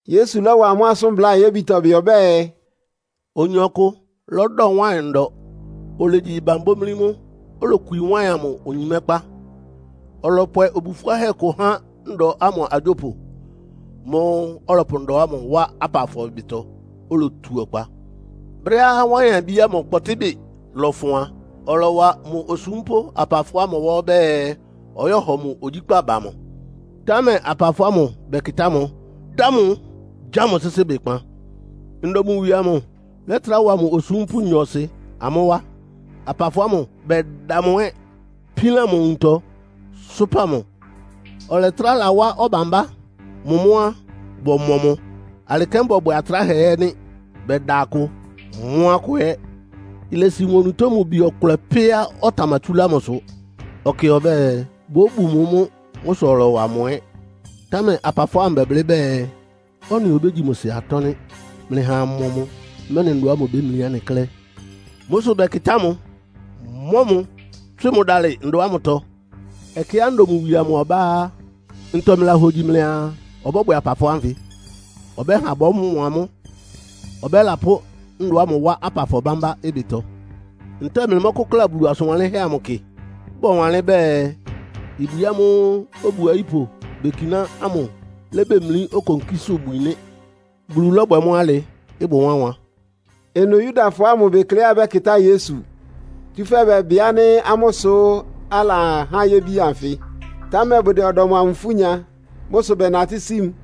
Yesu lɔ́wa amʋ́ asʋ́n bláa ayébitɔ bɩ. Ɔbɛ́ɛ, “Oyin ɔkʋ lɔ́dɔ wáɩn ndɔ. Olegyi ɩban bómlí mʋ́. Olokwi wáɩn amʋ onyimɛ́kpá, ɔlɔpwɛ obu fʋ́áhɛ́ kʋ há ndɔ ámʋ agyópʋ. Mʋ́ʋ́ ɔlɔpʋ ndɔ ámʋ wá apafɔ ɩbɩtɔ, olotu ɔkpa. Brɛ́á wáɩn-abí ámʋ kpɔtɩ́bɩ lɔfʋn a, ɔlɔwa mʋ osúmpʋ́ apafɔ ámʋ wá ɔbɛ́ɛ, ɔyɔ́hɔ mʋ ogyíkpá ba mʋ. Támɛ apafɔ ámʋ bɛkɩtá mʋ, dá mʋ, gya mʋ sɩ́sɩ́ ɩbɩkpan. Ndɔ mʋ wie amʋ lɛ́trá wa mʋ osúmpʋ́ nyɔɔsɩ amʋ́ wá. Apafɔ ámʋ bɛda mʋ ɛ́, pílan mʋ nwuntɔ, sʋ́pa mʋ. Ɔlɛtrá lawá ɔbambá. Mʋ mʋ́ á, bɔmɔ mʋ. Alɩ kɛ́n bɔbwɛ atráhɛ ɛ́ nɩ́. Bɛda akʋ, mɔ́ akʋ ɛ́. Ilesi mʋ onutó mʋ bi ɔkʋlɛ pɛ́á ɔtamatsúlá mʋsʋ. Ɔkɩ ɔbɛ́ɛ, bóbu mʋ mʋ́. Mʋ́ sʋ ɔlɔwa mʋ ɛ́. Támɛ apafɔ ámʋ bɛblɩ́ bɛɛ, ‘Ɔ́nɩ obégyi mʋ sɩ atɔ́ nɩ́. Mlɩha amɔ mʋ, mɛ́nɩ ndɔ ámʋ ibémlí anɩ klɛ́.’ Mʋ́ sʋ bɛkɩtá mʋ, mɔ́ mʋ́, tswɩ mʋ dálɩ ndɔ ámʋtɔ. “Ɛkɛá ndɔ mʋ wie amʋ ɔbá á, ntɔ mlɩlahogyi mlɩaa ɔbɔ́bwɛ apafɔ ánfɩ? Ɔbɛ́ha bɔmɔ amʋ́. Ɔbɛ́lapʋ́ ndɔ ámʋ wá apafɔ bámbá ɩbɩtɔ. Ntɛ́ɛ mlɩmɔ́kʋ́kla Bulu asʋn wanlɩ́nhɛ́ amʋ kɩ? Bɔwanlɩ́n bɛɛ, ‘Ibwi ámʋ́ʋ́ obu ayípʋ bekiná ámʋ lébemlí okonkísʋ́bwi nɩ́. Bulu lɔ́bwɛ mʋ́ alɩ. Ɩbʋ wánwan.’” Ɩnʋ Yudafɔ ámʋ bekleá bɛ́kɩtá Yesu, tsúfɛ́ bɛbɩ ánɩ́ amʋ́ sʋ alahá yébi ánfɩ, támɛ bʋdɛ ɔdɔm amʋ ifú nya. Mʋ́ sʋ bɛnatɩ́ sí mʋ.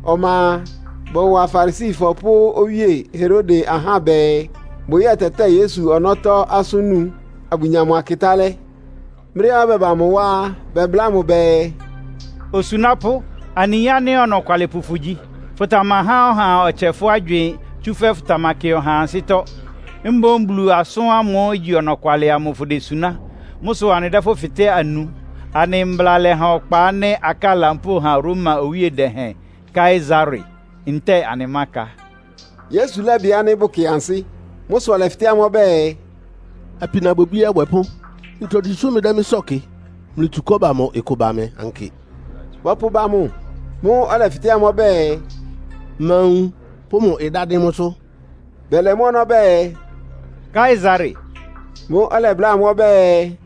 Ɔma a, bɔwa Farisifɔ pʋ́ Owíe Herode ahá bɛɛ, bʋyɛ́tɛtɛ́ɛ Yesu ɔnɔ́tɔ́ asʋ́n nu, abʋnya mʋ akɩtálɛ́. Brɛ́á bɛba mʋ wá á, bɛbláa mʋ bɛɛ, “Osunápʋ́, anɩyin ánɩ́ ɔnɔkwalɩpʋ fʋgyi. Fʋtamahá ɔhaa ɔtsɛ fʋ́ agywɩɩn, tsúfɛ́ fʋtamakɩ ɔhaa ansɩ́tɔ́. Mboún Bulu asʋ́n ámʋ́ʋ́ igyi ɔnɔkwalɩ amʋ fʋdesuná. Mʋ́ sʋ anɩdɛ́ fʋ́ fɩtɛ́ anu. Anɩ mbla lɛha ɔkpa ánɩ́ akáa lampóo ha Roma owíe dɛhɛn Kaesare, ntɛ́ɛ anɩmáka?” Yesu lɛ́bɩ ánɩ́ bʋkɩ ansɩ́. Mʋ́ sʋ ɔlɛfɩtɛ́ amʋ́ ɔbɛ́ɛ, “Apinabwɛbí abwɛpʋ́, ntogyi sʋ́ mlɩdɛ́ mɩ́ sɔ́ɔ kɩ? Mlɩtsu kɔ́ba amʋ ɩkʋ ba mɩ ankɩ.” Bɔpʋba mʋ. Mʋ́ʋ́ ɔlɛfɩtɛ́ amʋ́ ɔbɛ́ɛ, “Ma nwun pʋ́ mʋ ɩdá dɩ́n mʋ́sʋ́?” Bɛlɛ mʋ́ ɔnɔ́ bɛɛ, “Kaesare.” Mʋ́ʋ́ ɔlɛbláa amʋ́ ɔbɛ́ɛ,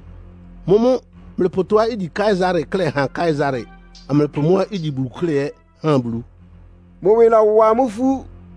“Mʋ́mʋ́ mlɩpʋ tɔ́á igyi Kaesare klɛ́ ha Kaesare, amlɩpʋ mʋ́á igyi Bulu klɛ́ ɛ́ ha Bulu.” Mʋ ɩwɩ lɔ́wa amʋ́ ifú.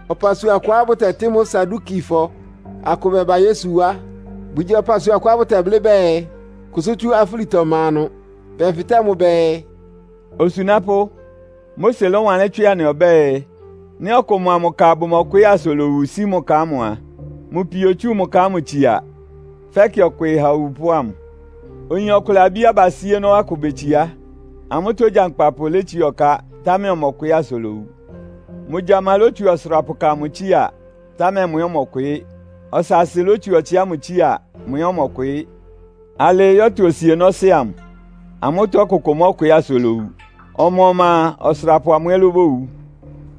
Ɔpasua kʋá bʋtɛtɩ́ mʋ́ Sadukifɔ akʋ bɛba Yesu wá. Bʋgyi ɔpasua kʋá bʋtɛblɩ́ bɛɛ, kʋsʋ́ tsú afúlitɔ ma ɩnʋ. Bɛfɩtɛ́ mʋ bɛɛ, “Osunápʋ́, Mose lɔ́wanlɩ́n tswɩ anɩ ɔbɛ́ɛ, ‘Nɩ́ ɔkʋ mʋa mʋ ka bʋmɔkwɩɩ́ asa olowu sí mʋ ka ámʋ a, mʋ pio otsú mʋ ka ámʋ tsia, fɛ́kɩ ɔkwɩɩ ha owupʋ́ ámʋ.’ Oyin ɔkʋlɛ abí abasíénɔ́ akʋ betsiá. Amʋ́tɔ́ ogyankpapʋ létsiá ɔká, támɛ ɔmɔkwɩɩ́ asa olowu. Mʋ gyama lótsu ɔsʋrapʋka amʋ tsía, támɛ mʋ ɛ́ ɔmɔkwɩɩ́. Ɔsaasɩ lótsu ɔtsɩ ámʋ tsía. Mʋ ɛ́ ɔmɔkwɩɩ́. Alɩɩ yɔ́tʋ osienɔ́sɩ́ amʋ. Amʋ́tɔ́ ɔkʋkʋ mɔ́kwɩɩ́ asa olowu. Ɔma-ɔma a, ɔsʋrapʋ amʋ ɛ́ lóbowu.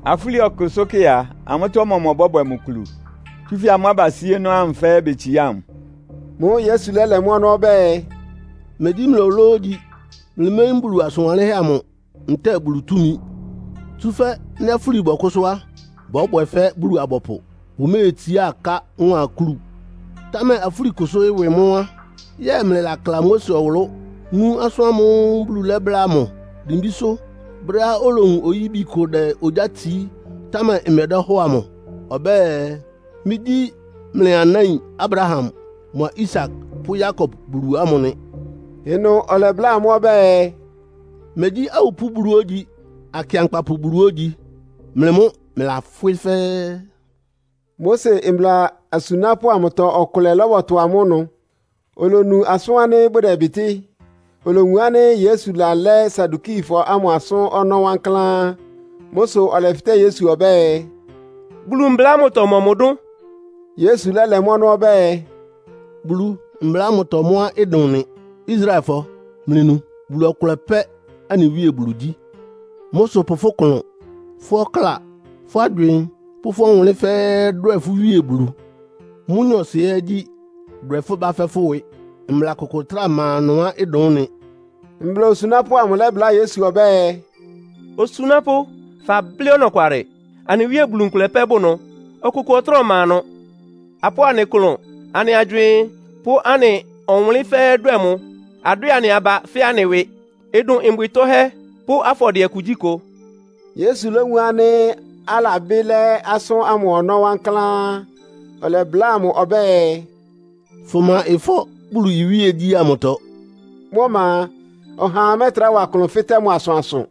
Afúli ɔkʋsʋ́kɛ́ a, amʋ́tɔ́ ɔmɔmʋ ɔbɔ́bwɛ mʋ kulu? Tsúfɛ́ amʋ́ abasíénɔ́ ámʋ fɛ́ɛ́ betsiá mʋ.” Mʋ́ʋ́ Yesu lɛ́lɛ mʋ́ ɔnɔ́ ɔbɛ́ɛ, “Megyí mlɩ ológyi. Mlɩméyín Bulu asʋn wanlɩ́nhɛ́ amʋ ntɛ́ɛ Bulu túmi. Tsúfɛ́ nɩ́ afúli bɔkʋ́sʋ́ á, bɔ́bwɛ fɛ́ Bulu-abɔpʋ. Bʋméetsiá aká mʋ́a akúlu. Támɛ afúlikʋsʋ́ ɩwɩ mʋ́ á, yɛ́ɛ mlɩlakla Mose ɔwʋlʋ́, nú asʋ́n ámʋ́ʋ́ Bulu lɛ́bláa mʋ dimbísʋ́ brɛ́á olowun oyíbi kʋ dɛ ogyá tsií, támɛ ɩmɛdɛ́hɔ́ɔ amʋ? Ɔbɛ́ɛ, ‘Mɩ́gyí mlɩ anáin Abraham mʋa Isak pʋ́ Yakob Bulu ámʋ nɩ.’” Ɩnʋ ɔlɛbláa amʋ́ ɔbɛ́ɛ, “Megyí awupʋ́ Bulu ógyi, akɩankpapʋ Bulu ógyi. Mlɩ mʋ́ mlɩlafwɩ́ fɛ́ɛ́.” Mose mbla asunápʋ́ amʋtɔ ɔkʋlɛ lɔ́bɔtʋ amʋ́ ɩnʋ, olonu asʋ́n ánɩ́ bʋdɛbɩtɩ́. Olowun ánɩ́ Yesu lalɛ́ Sadukifɔ ámʋ asʋ́n ɔnɔ́ wankláán. Mʋ́ sʋ ɔlɛfɩtɛ́ Yesu ɔbɛ́ɛ, “Bulu mbla ámʋtɔ mɔmʋ dʋ́n?” Yesu lɛ́lɛ mʋ́ ɔnɔ́ ɔbɛ́ɛ, “Bulu mbla ámʋtɔ mʋ́á ɩdʋn nɩ. ‘Israelfɔ, mlɩnu. Bulu ɔkʋlɛ pɛ́ anɩ Wíe Bulu gyí. Mʋ́ sʋ pʋ fʋ́ klʋn, fʋ́ ɔkláa, fʋ́ agywɩɩn pʋ́ fʋ́ ɔwʋnlɩ́n fɛ́ɛ́ dwɛ fʋ́ Wíe Bulu.’ Mʋ́ nyɔɔsɩ ɛ́ gyí, ‘Dwɛ fʋ́ bá fɛ́ fʋ́ ɩwɩ.’ Mbla kʋkʋ ɩtráa ma ɩnʋá ɩdʋn ɩ́nɩ.” Mbla osunápʋ́ amʋ lɛ́bláa Yesu ɔbɛ́ɛ, “Osunápʋ́, fablɩ́ ɔnɔkwalɩ. Anɩ Wíe Bulu nkʋlɛ pɛ́ bʋ ɩnʋ, ɔkʋkʋ trá ɔma ɩnʋ. Apʋ́ʋ anɩ klʋn, anɩ agywɩɩn pʋ́ anɩ ɔwʋnlɩ́n fɛ́ɛ́ dwɛ́ mʋ, adwɛ anɩ aba fɛ́ anɩ ɩwɩ. Ɩdʋn mbwɩ tɔ́hɛ́ pʋ́ afɔdɩɛ kugyíkʋ.” Yesu lówun ánɩ́ alabɩ́ lɛ́ asʋ́n ámʋ ɔnɔ́ wankláán, ɔlɛbláa mʋ ɔbɛ́ɛ, “Fʋma ɩfɔ́ Bulu iwíegyí ámʋtɔ.” Mʋ́ ɔma a, ɔhaa mɛ́trá wa klʋn fɩtɛ́ mʋ asʋansʋ.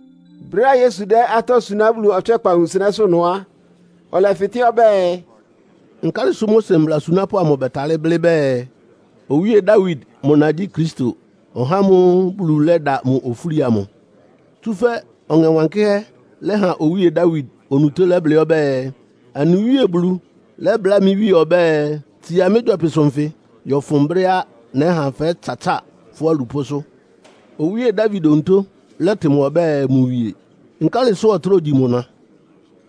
Brɛ́á Yesu dɛ́ atɔ́ suná Bulu ɔtswɛ́kpa nwunsɩnɛ́sʋ́ ɩnʋ á, ɔlɛfɩtɛ́ ɔbɛ́ɛ, “Nkálɩ sʋ́ Mose mbla asunápʋ́ amʋ bɛtalɩ́ blɩ́ bɛɛ, Owíe Dawid mʋ na gyí Kristo, (ɔhá ámʋ́ʋ́ Bulu lɛ́da mʋ ofúli amʋ)? Tsúfɛ́ Ɔŋɛ Wankɩ́hɛ́ lɛ́ha Owíe Dawid onutó lɛ́blɩ́ ɔbɛ́ɛ, ‘Anɩ Wíe Bulu lɛ́bláa mɩ́ Wíe ɔbɛ́ɛ, “Tsia mɩ́ gyɔpɩsʋ nfɩ yɔ́fʋn brɛ́á nɛ́ha fɛ́tsatsáa fʋ́ alupʋ́sʋ́.” ’ Owíe Dawid onutó lɛ́tɩ mʋ ɔbɛ́ɛ mʋ wie. Nkálɩ sʋ ɔtráa ogyi mʋ na?”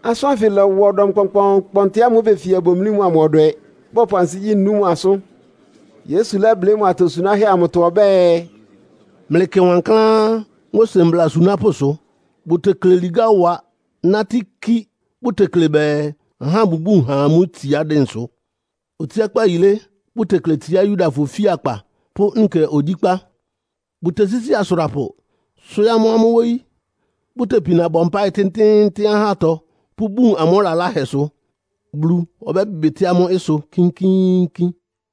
Asʋ́n ánfɩ lɔ́wa ɔdɔm kpɔnkpɔɔnkpɔntɩ ámʋ́ʋ́ befia bomlí mʋ amʋ ɔdwɛ, bɔpʋ ansigyí nú mʋ asʋ́n. Yesu lɛ́blɩ́ mʋ atosunáhɛ́ amʋtɔ ɔbɛ́ɛ, “Mlɩkɩ wankláán Mose mbla asunápʋ́sʋ. Bʋtekle ligá wa nátɩ́ kí, bʋtekle bɛɛ, ahá bʋbún ha amʋ́ itsiá dɩnsʋ. Otsiákpá yilé bʋtekle tsiá Yudafɔ ofíakpa pʋ́ nkɛ ogyíkpá. Bʋtesísi asʋrapʋ, swɩ́ɩ́ amʋ́ amʋ́ wóyí. Bʋtepina bɔ mpáɩ tɩ́ntɩ́ɩ́ntɩ́n ahátɔ pʋ́bun amʋ́ lalahɛsʋ. Bulu ɔbɛ́bɩtɩ́ amʋ́ ɩsʋ kínkíínkín!”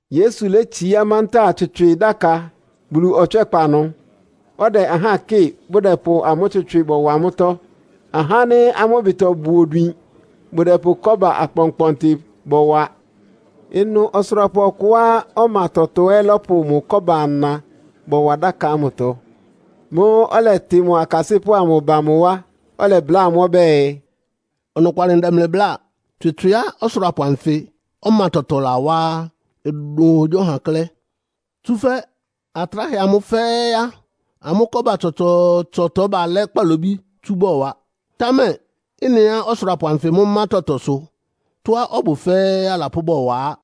Yesu létsiá mantáa tswɩtswɩ dáka Bulu ɔtswɛ́kpa ɩnʋ, ɔdɛ ahá kɩ́ɩ bʋdɛpʋ amʋ́ tswɩtswɩ bɔwa mʋ́tɔ́. Ahá ánɩ́ amʋ́ ɩbɩtɔ bʋ odwin bʋdɛpʋ kɔ́ba akpɔnkpɔntɩ bɔwa. Ɩnʋ ɔsʋrapʋ ɔkʋá ɔma tɔtɔ ɛ́ lɔ́pʋ mʋ kɔ́ba-ana bɔwa dáka ámʋtɔ. Mʋ́ʋ́ ɔlɛtɩ mʋ akasɩ́pʋ́ amʋ ba mʋ wá, ɔlɛbláa amʋ́ ɔbɛ́ɛ, “Ɔnɔkwalɩ ndɛ mlɩ bláa, tswɩtswɩá ɔsʋrapʋ anfɩ́ ɔma tɔtɔ lawá á, ɩdʋn ɔhagyíɔha klɛ́. Tsúfɛ́ atráhɛ amʋ fɛ́ɛ́ á, amʋ́ kɔ́ba tsɔtsɔɔtsɔtɔ balɛ́ kpalobí tsú bɔwa. Támɛ ɩ́nɩá ɔsʋrapʋ anfɩ mʋ́ má tɔtɔ sʋ tɔ́á ɔbʋ fɛ́ɛ́ alapʋ́ bɔwa á.”